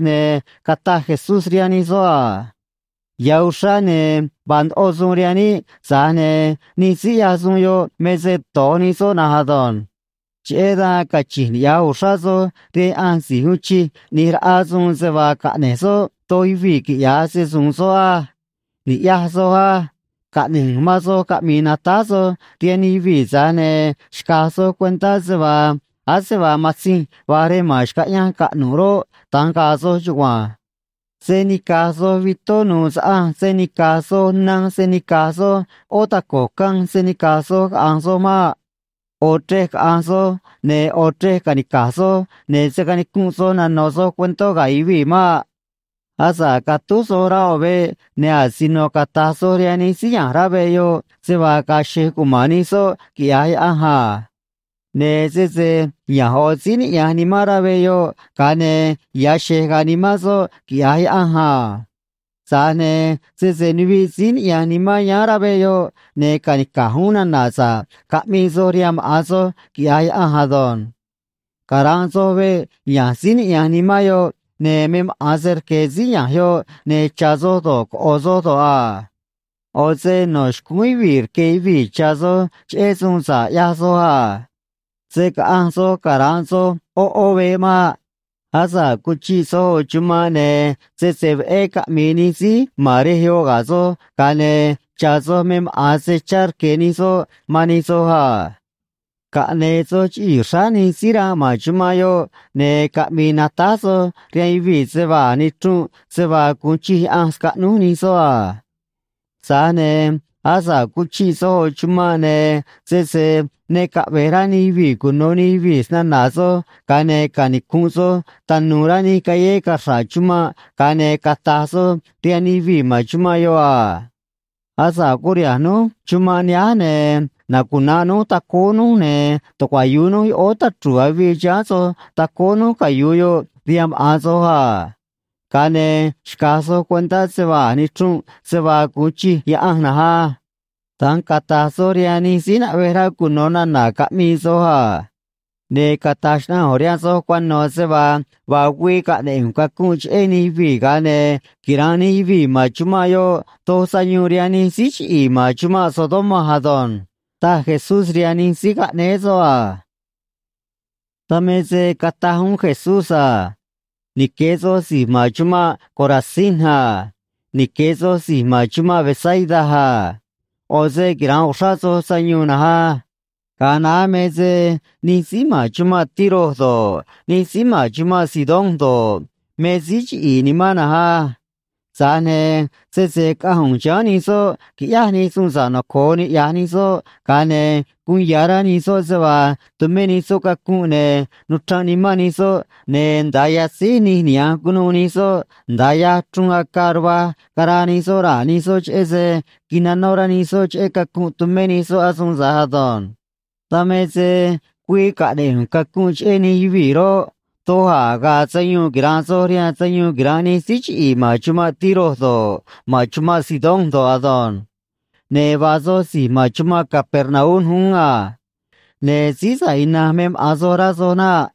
ne̱ cataj Jesús rihaan nij soꞌ a: ―Ya̱ uxrá, ne̱ vaa ndoꞌo suun rihaan níꞌ, tza̱j ne̱ nij síí ꞌyaj suun yoꞌ me se do̱j nij soꞌ na̱nj ado̱nj. Cheꞌé dan cachi̱nj niꞌya̱j uxrá soj rihaan Yaꞌanj si̱j uun chij ꞌni̱j raꞌa suun se vaa caꞌne̱j soꞌ doj yuvii̱ quiꞌya̱j se‑su̱u̱n soꞌ á. Ni̱ꞌyaj soj á. Caꞌne̱j ꞌu̱nj man soj caꞌmi̱i̱ natáj soj rihaan nij yuvii̱, tza̱j ne̱ xca̱j soj cuentá se vaa ase vaa matzinj va̱j rej ma̱n xcaꞌyanj caꞌnu̱ꞌ roꞌ, da̱nj ga̱a̱ soj chugua̱nj. Se̱ nica̱j soj vitó nu̱u̱ saꞌanj se̱ nica̱j soj nanj se̱ nica̱j soj ꞌó taco̱j canj se̱ nica̱j soj caꞌa̱nj soj maꞌ. ꞌO̱ chrej caꞌa̱nj soj, ne̱ ꞌo̱ chrej ca̱nica̱j soj, ne̱ se̱ canicunꞌ soj nano̱ soj cuentó ga̱ yuvii̱ maꞌ. ’Asa̱ꞌ catúj soj rá ꞌo̱ veꞌ, ne̱ asino cata̱j soj rihaan nij síí ya̱nj rá veꞌ yoꞌ se vaa ga̱a̱ xe̱j cuma̱n nij soꞌ, quiꞌya̱j Yaꞌanj a. Ne̱ sese ya̱nj ꞌo̱ síí niꞌya̱nj nimán rá veꞌ yoꞌ, ga̱a ne̱ ya̱ xe̱j ga̱a̱ nimán soꞌ, quiꞌya̱j Yaꞌanj a. Tza̱j ne̱ sese nuviꞌ síí niꞌya̱nj nimán yáán rá veꞌ yoꞌ, ne̱ ca̱nica̱j uún nana̱ sa̱ꞌ caꞌmii soj rihaan maꞌa̱n soj, quiꞌya̱j Yaꞌanj ado̱nj. Cara̱nꞌ soj veꞌ ya̱nj síí niꞌya̱nj nimán yoꞌ, ne̱ me maꞌa̱n se rque̱ síí ya̱nj yoꞌ, ne̱ cha̱ soj do̱ꞌ, coꞌo̱ soj do̱ꞌ a. ꞌO̱ se no̱ xcúún yuvii̱ rque̱ yuvii̱ cha̱ soj cheꞌé suun sa̱ꞌ ꞌyaj soj a. Se̱ caꞌanj soj cara̱nꞌ soj ꞌó ꞌó veꞌ maꞌ. Asa̱ꞌ cuchiꞌ soj ꞌo̱ chumanꞌ, ne̱ sese veꞌé caꞌmi̱i̱ nij síí ma̱n rej yoꞌ ga̱ soj, ga̱a ne̱ cha̱ soj me maꞌa̱n se chá rque̱ nij soꞌ man nij soj a. Caꞌne̱e̱ soj chiꞌii̱ xráá nij síí ranꞌ ma̱n chumanꞌ yoꞌ, ne̱ caꞌmi̱i̱ natáj soj rihaan yuvii̱ se vaa a̱j nichrunꞌ se vaa gu̱un chij Yaꞌanj scaꞌnúj nij soꞌ a. ’Tza̱j ne̱ asa̱ꞌ cuchiꞌ soj ꞌo̱ chumanꞌ, ne̱ sese ne caꞌve̱j rá nij yuvii̱ cuno̱ nij yuvii̱ snana̱ soj, ga̱a ne̱ canicu̱nꞌ soj tanu̱u̱ rá nij callé caxra̱ꞌ chumanꞌ, ga̱a ne̱ cata̱j soj rihaan nij yuvii̱ ma̱n chumanꞌ yoꞌ a: “Asa̱ꞌ curiha̱nj núj chumanꞌ nihánj, ne̱ nacuna̱nꞌ núj tacóó núj, ne̱ tucuayu̱u núj yoꞌóó tachru̱u̱ avii chiháán soj tacóó núj cayu̱u yoꞌ rihaan maꞌa̱n soj a. Ga̱a ne̱ xca̱j soj cuentá se vaa a̱j nichrunꞌ se vaa gu̱un chij Yaꞌanj na̱nj á.” Da̱nj cata̱j soj rihaan nij síí naꞌvej rá cuno̱ nana̱ caꞌmii soj a. Ne̱ cata̱j xnaꞌanj ꞌu̱nj rihaan soj cuano̱ se vaa vaa güii caꞌne̱ꞌ ꞌu̱nj cacunꞌ cheꞌé nij yuvii̱, ga̱a ne̱ quira̱nꞌ nij yuvii̱ ma̱n chumanꞌ yoꞌ doj sayuun rihaan nij síí chiꞌi̱i̱ ma̱n chumanꞌ Sodoma ado̱nj ―taj Jesús rihaan nij síí caꞌnéé soꞌ a. Dan me se cataj uún Jesús a: ―Nique̱ soj si̱j ma̱n chumanꞌ Corazín a. Nique̱ soj si̱j ma̱n chumanꞌ Betsaida a. ꞌO̱ se quira̱nꞌ uxrá soj sayuun na̱nj á. Ga̱a naá me se nij síí ma̱n chumanꞌ Tiro do̱ꞌ, nij síí ma̱n chumanꞌ Sidón do̱ꞌ, me síí chiꞌi̱i̱ nimán na̱nj á. Tza̱j ne̱ sese caꞌanj ꞌu̱nj chiháán nij soꞌ quiꞌyáj nij suun sa̱ꞌ noco̱o niꞌya̱j nij soꞌ, ga̱a ne̱ guun ya̱ rá nij soꞌ se vaa tumé nij soꞌ cacunꞌ, ne̱ nuchranꞌ nimán nij soꞌ, ne̱ nda̱a yatzíj nij niha̱nj cunuû nij soꞌ, nda̱a yaj chruun acaa ruvaj caraa nij soꞌ raa̱ nij soꞌ cheꞌé se quinanó rá nij soꞌ cheꞌé cacunꞌ tumé nij soꞌ asuun tza̱j ado̱nj. Dan me se güii caꞌne̱ꞌ ꞌu̱nj cacunꞌ cheꞌé nij yuvii̱ roꞌ, doj a̱ ga̱a̱ sayuun quira̱nꞌ soj rihaan sayuun quira̱nꞌ nij síí chiꞌi̱i̱ ma̱n chumanꞌ Tiro do̱ꞌ, ma̱n chumanꞌ Sidón do̱ꞌ ado̱nj. Ne̱ vaa soj si̱j ma̱n chumanꞌ Capernaum uún a. Ne̱ síí sa̱ꞌ ina̱nj me maꞌa̱n soj, rá soj naꞌ.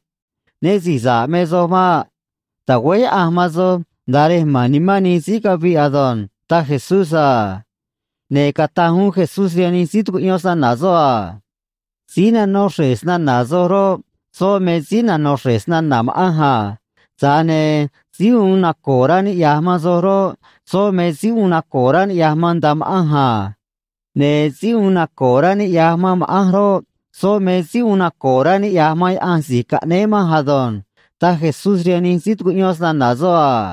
Né si̱j sa̱ꞌ me soj maꞌ. Ta̱güéj Yaꞌanj man soj nda̱a rej ma̱n nimán nij síí caviꞌ ado̱nj ―taj Jesús a. Ne̱ cataj uún Jesús rihaan nij síí tucuꞌyón snana̱ soꞌ a: ―Síí nanó xre̱j snana̱ soj roꞌ, soꞌ me síí nanó xre̱j snana̱ ma̱ꞌanj a. Tza̱j ne̱ síí uun naco̱o̱ rá niꞌya̱j man soj roꞌ, soꞌ me síí uun naco̱o̱ rá niꞌya̱j man nda̱a ma̱ꞌanj a. Ne̱ síí uun naco̱o̱ rá niꞌya̱j man ma̱ꞌanj roꞌ, soꞌ me síí uun naco̱o̱ rá niꞌya̱j man Yaꞌanj si̱j caꞌnéé manj ado̱nj ―taj Jesús rihaan nij síí tucuꞌyón snana̱ soꞌ a.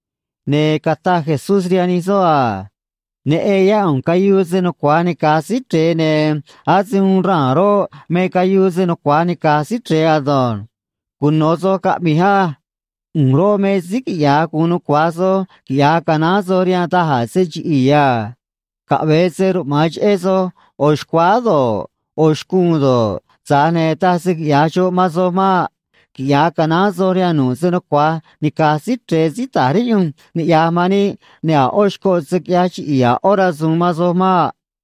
Ne̱ cataj Jesús rihaan nij soꞌ a: ―Neꞌen yá ꞌu̱nj cayuu se nucua̱j nica̱j Síí Chre̱e, ne̱ ase uun raa̱n roꞌ, me cayuu se nucua̱j nica̱j Síí Chre̱e ado̱nj. Cuno̱ soj caꞌmi̱j á. ꞌU̱nj roꞌ, me síí quiꞌya̱j gu̱un nucua̱j soj quiꞌya̱j canaán soj rihaan da̱j a̱ se chiꞌi̱i̱ a. Caꞌve̱e se ruꞌma̱an cheꞌé soj ꞌo̱ xcuáá do̱ꞌ, ꞌo̱ xcuun do̱ꞌ, tza̱j ne̱ taj se quiꞌya̱j xoꞌ man soj maꞌ. Quiꞌya̱j canaán soj rihaan nu̱ꞌ se nucua̱j nica̱j Síí Chre̱e síí ta̱j riꞌyunj niꞌya̱j man níꞌ, ne̱ a̱ ꞌó xcoꞌ se̱ quiꞌyaj chiꞌi̱i̱ a̱ ꞌó rasu̱u̱n man soj maꞌ.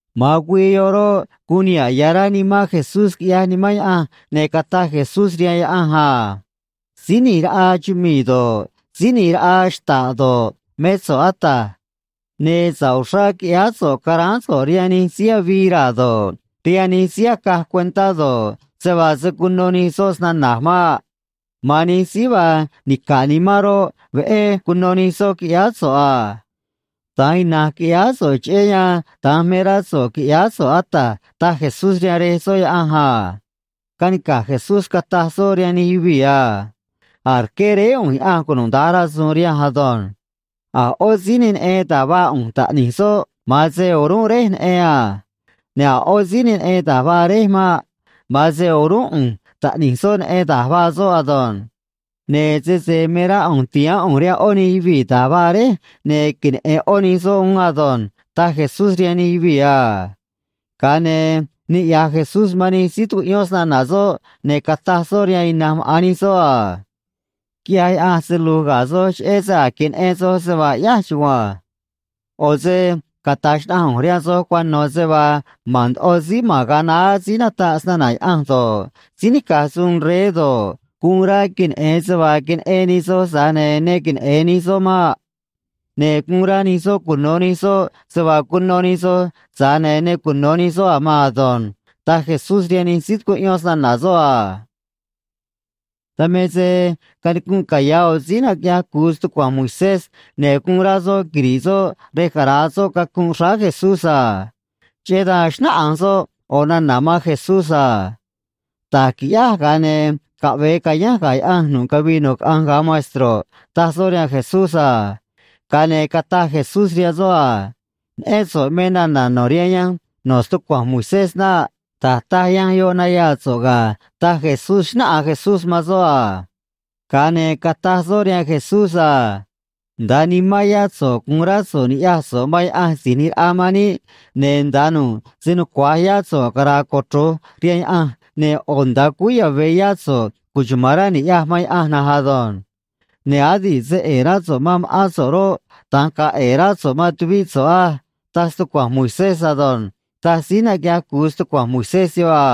Ma̱an güii yoꞌ roꞌ, guun niha̱ꞌ ya̱ rá nimán Jesús, quiꞌyaj Nimán Yaꞌanj, ne̱ cataj Jesús rihaan Yaꞌanj a: ―Síí ꞌNi̱j Raꞌa chumii̱ do̱ꞌ, Síí ꞌNi̱j Raꞌa xta̱ꞌ do̱ꞌ, mé so̱ꞌ, Ata̱j. Ne̱ sa̱ꞌ uxrá quiꞌyáá so̱ꞌ caráán so̱ꞌ rihaan nij síí avii raa̱ do̱ꞌ, rihaan nij síí acaj cuentá do̱ꞌ, se vaa se̱ cuno nij soꞌ snana̱j maꞌ. Ma̱an nij síí vaa nica̱ꞌ nimán roꞌ, veꞌé cuno nij soꞌ, quiꞌyáá so̱ꞌ a. Da̱nj ina̱nj quiꞌyáá so̱ꞌ, cheꞌé yan da̱nj me rá so̱ꞌ qui̱ꞌyáá so̱ꞌ, Ata̱j ―taj Jesús rihaan Rej soꞌ Yaꞌanj a. Canica̱j Jesús, cataj soꞌ rihaan nij yuvii̱ a: ―A̱j rqué Réé ꞌu̱nj Yaꞌanj cunuda̱nj rasu̱u̱n rihanj ado̱nj. A̱ ꞌó síí ne neꞌen da̱j vaa ꞌu̱nj Taꞌni̱j soꞌ, ma̱an se o̱rúnꞌ Réj neꞌen a. Ne̱ a̱ ꞌó síí ne neꞌen da̱j vaa Réj maꞌ. Ma̱an se o̱rúnꞌ ꞌu̱nj Taꞌni̱j soꞌ neꞌen da̱j vaa soꞌ ado̱nj. Ne̱ sese me rá ꞌu̱nj ti̱haán ꞌu̱nj rihaan ꞌó nij yuvii̱ da̱j vaa Réj, ne̱ queneꞌe̱n ꞌó nij soꞌ uún ado̱nj ―taj Jesús rihaan nij yuvii̱ a. Ga̱a ne̱ niꞌya̱j Jesús man nij síí tucuꞌyón snana̱ soꞌ, ne̱ cataj soꞌ rihaan ina̱nj maꞌa̱n nij soꞌ a: ―Quiꞌyaj Yaꞌanj se lu̱j ga̱ soj cheꞌé se a̱j queneꞌen soj se vaa ꞌyáj chugua̱nj. ꞌO̱ se cata̱j xnaꞌanj ꞌu̱nj rihaan soj cuano̱ se vaa ma̱n ndoꞌo síí ma̱n ga̱a naá síí nataꞌ snana̱ Yaꞌanj do̱ꞌ, síí nica̱j suun rey do̱ꞌ, guun rá queneꞌe̱n se vaa queneꞌen nij soj, tza̱j ne̱ ne queneꞌe̱n nij soꞌ maꞌ. Ne̱ guun rá nij soꞌ cuno̱ nij soꞌ se vaa cuno nij soj, tza̱j ne̱ ne cuno̱ nij soꞌ a̱ maan ado̱nj ―taj Jesús rihaan nij síí tucuꞌyón snana̱ soꞌ a. Dan me se canicunꞌ caya̱ ꞌo̱ síí naquiꞌyaj cu̱u stucua̱nj Moisés, ne̱ guun rá soꞌ quiri̱ꞌ soꞌ rej cara̱a soꞌ cacunꞌ xráá Jesús a. Cheꞌé dan xnáꞌanj soꞌ ꞌo̱ nana̱ man Jesús a: ―Da̱j qui̱ꞌyáj, ga̱a ne̱ caꞌve̱e ca̱yánj ga̱ Yaꞌanj nu̱ꞌ cavii nu̱ꞌ caꞌanj, ga̱a maestro̱ꞌ ―taj soꞌ rihaan Jesús a. Ga̱a ne̱ cataj Jesús rihaan soꞌ a: ―Neꞌén so̱ꞌ me nana̱ no̱ rihaan yanj no̱ stucua̱nj Moisés naꞌ. Da̱j taj yanj yoꞌ nayaa so̱ꞌ ga̱ ―taj Jesús, xnáꞌanj Jesús man soꞌ a. Ga̱a ne̱ cataj soꞌ rihaan Jesús a: ―“Nda̱a nimán yá so̱ꞌ gu̱un rá so̱ꞌ ni̱ꞌyaj so̱ꞌ man Yaꞌanj Si̱j ꞌNi̱j Raꞌa man níꞌ, ne̱ nda̱a nu̱ꞌ se nucua̱j yá so̱ꞌ cara̱a̱ cochro̱j rihaan Yaꞌanj, ne̱ ꞌo̱ nda̱a cúú yave̱ yá so̱ꞌ cuchuma̱n rá ni̱ꞌyaj man Yaꞌanj na̱nj ado̱nj.” Ne̱, “Adi̱ꞌ se ꞌe̱e̱ rá so̱ꞌ man ma̱ꞌán so̱ꞌ roꞌ, da̱nj ga̱a̱ ꞌe̱e̱ rá so̱ꞌ man tuvíꞌ so̱ꞌ á”, taj stucua̱nj Moisés ado̱nj ―taj síí naquiꞌyaj cu̱u stucua̱nj Moisés yoꞌ a.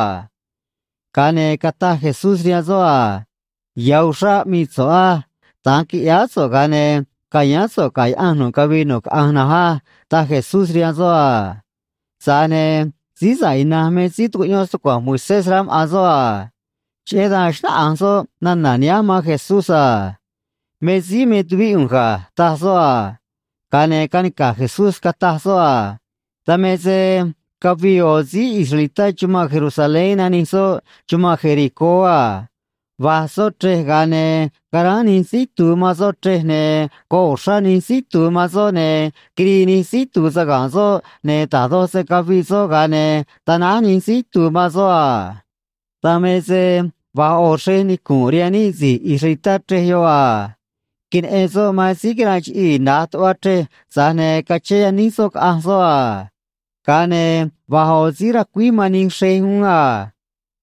Ga̱a ne̱ cataj Jesús rihaan soꞌ a: ―Ya̱ uxrá aꞌmii so̱ꞌ á. Da̱nj qui̱ꞌyáá so̱ꞌ, ga̱a ne̱ ca̱yáán so̱ꞌ ga̱ Yaꞌanj nu̱ꞌ cavii nu̱ꞌ caꞌanj na̱nj á ―taj Jesús rihaan soꞌ a. Tza̱j ne̱ síí sa̱ꞌ ina̱nj me síí tucuꞌyón stucua̱nj Moisés, rá maꞌa̱n soꞌ a. Cheꞌé dan xnáꞌanj soꞌ nana̱ nihánj man Jesús a: ―Me síí me tuvíꞌ ꞌu̱nj ga̱ ―taj soꞌ a. Ga̱a ne̱ canica̱j Jesús, cataj soꞌ a: ―Dan me se cavii ꞌo̱ síí israelitá chumanꞌ Jerusalén, nanij soꞌ chumanꞌ Jericó a. Va̱j soꞌ chrej, ga̱a ne̱ caráán nij síí itu̱u̱ man soꞌ chrej, ne̱ goꞌ uxrá nij síí itu̱u̱ man soꞌ, ne̱ quirii nij síí itu̱u̱ saga̱nꞌ soꞌ, ne̱ da̱j doj se caviꞌ soꞌ, ga̱a ne̱ tanáj nij síí itu̱u̱ man soꞌ a. Dan me se va̱j ꞌo̱ xrej nicu̱nꞌ rihaan níꞌ si̱j israelitá chrej yoꞌ a. Queneꞌen soꞌ man síí quiranꞌ chiꞌii̱ na̱j tuꞌva chrej, tza̱j ne̱ cachén yaníj soꞌ caꞌanj soꞌ a. Ga̱a ne̱ va̱j ꞌo̱ síí racuíj man nij xrej uún a.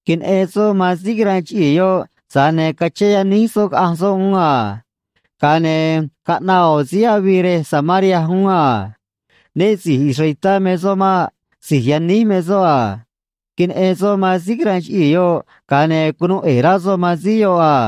Queneꞌen soꞌ man síí quiranꞌ chiꞌii̱ yoꞌ, tza̱j ne̱ cachén yaníj soꞌ caꞌanj soꞌ uún a. ’Ga̱a ne̱ caꞌnaꞌ ꞌo̱ síí avii rej Samaria uún a. Né si̱j israelitá me soꞌ maꞌ; si̱j yaníj me soꞌ a. Queneꞌen soꞌ man síí quiranꞌ chiꞌii̱ yoꞌ, ga̱a ne̱ cunuu ꞌe̱e̱ rá soꞌ man síí yoꞌ a.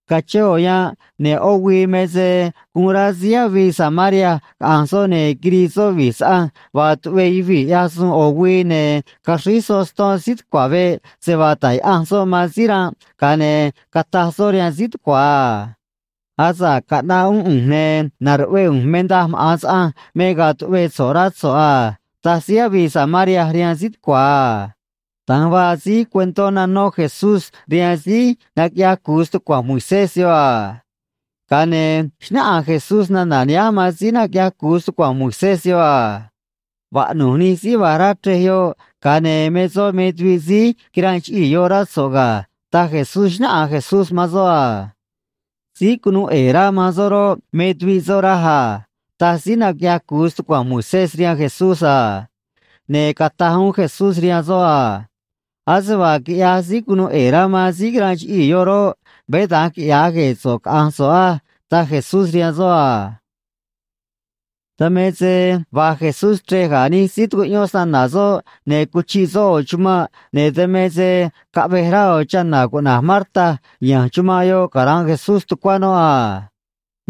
Cachén ꞌo̱ yanꞌ, ne̱ ꞌó güii me se guun rá síí avii Samaria caꞌa̱nj soꞌ, ne̱ quirii soꞌ vi̱j saꞌanj vaa tuꞌvee yuvii̱ ꞌyaj suun ꞌo̱ güii, ne̱ caxríj soꞌ ston síí tucua̱ veꞌ se vaa ta̱j yaꞌanj soꞌ man síí ranꞌ, ga̱a ne̱ cataj soꞌ rihaan síí tucua̱ a: “Asa̱ꞌ caꞌnaꞌ uún ꞌu̱nj, ne̱ na̱ruꞌvee ꞌu̱nj me daj maꞌa̱n saꞌanj me ga̱a̱ tuꞌvee so̱ꞌ, rá so̱ꞌ a”, taj síí avii Samaria rihaan síí tucua̱ a ―da̱nj vaa síj cuentó nanó Jesús rihaan síí naquiꞌyaj cu̱u stucua̱nj Moisés yoꞌ a. Ga̱a ne̱ xnáꞌanj Jesús nana̱ nihánj man síí naquiꞌyaj cu̱u stucua̱nj Moisés yoꞌ a: ―Vaꞌnu̱j nij síí va̱j rá chrej yoꞌ, ga̱a ne̱ me soꞌ me tuviꞌ síí quiranꞌ chiꞌii̱ yoꞌ, rá so̱ꞌ ga̱ ―taj Jesús, xnáꞌanj Jesús man soꞌ a. ―Síí cunuu ꞌe̱e̱ rá man soꞌ roꞌ, me tuviꞌ soꞌ, raj a ―taj síí naquiꞌyaj cu̱u stucua̱nj Moisés rihaan Jesús a. Ne̱ cataj uún Jesús rihaan soꞌ a: ―Ase vaa quiꞌyaj síí cunuu ꞌe̱e̱ rá man síí quiranꞌ chiꞌii̱ yoꞌ roꞌ, veé da̱nj quiꞌya̱j gue̱e̱ so̱ꞌ, caꞌa̱nj so̱ꞌ á ―taj Jesús rihaan soꞌ a. Dan me se va̱j Jesús chrej ga̱ nij síí tucuꞌyón snana̱ soꞌ, ne̱ cuchiꞌ soꞌ ꞌo̱ chumanꞌ, ne̱ dan me se caꞌvej rá ꞌo̱ chana̱ cuꞌna̱j Marta ya̱nj chumanꞌ yoꞌ cara̱nꞌ Jesús tucuá noꞌ a.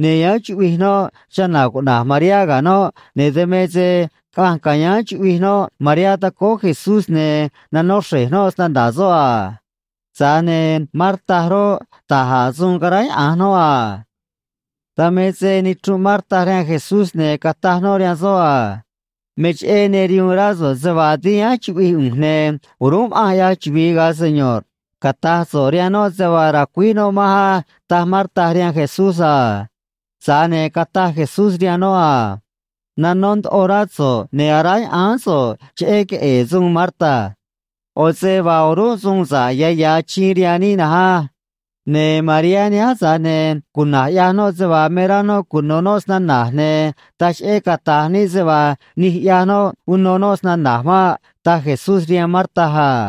Ne̱ yáán chuꞌvij noꞌ chana̱ cuꞌna̱j Mariá ga̱ noꞌ, ne̱ dan me se caꞌanj ca̱yáán chuꞌvij noꞌ Mariá tacóó Jesús, ne̱ nanó xre̱j noꞌ snana̱ soꞌ a. Tza̱j ne̱ Marta roꞌ, da̱j a̱ suun caráyaꞌa̱nj noꞌ a. Dan me se nichrunꞌ Marta rihaan Jesús, ne̱ cataj noꞌ rihaan soꞌ a: ―Me cheꞌé ne rihuun rá so̱ꞌ se vaa dínj yáán chuꞌvij ꞌu̱nj, ne̱ o̱rúnꞌ ma̱ꞌanj ꞌyaj chuvi̱i, ga̱a Seño̱rꞌ. Cata̱j so̱ꞌ rihaan noꞌ se vaa ra̱cuíj noꞌ manj á ―taj Marta rihaan Jesús a. Tza̱j ne̱ cataj Jesús rihaan noꞌ a: ―Nanó ndoꞌo rá so̱ꞌ ne̱ aráya̱ꞌáán so̱ꞌ cheꞌé queꞌe̱e̱ suun, Marta. ꞌO̱ se vaa o̱rúnꞌ suun sa̱ꞌ ya̱ ya̱ achiin rihaan níꞌ na̱nj á. Ne̱ Mariá nihánj, tza̱j ne̱ cuna̱j ꞌyaj noꞌ se vaa me rá noꞌ cuno̱ noꞌ snana̱j, ne̱ taj cheꞌé cata̱j níꞌ se vaa nij ꞌyaj noꞌ uno noꞌ snana̱j maꞌ ―taj Jesús rihaan Marta a.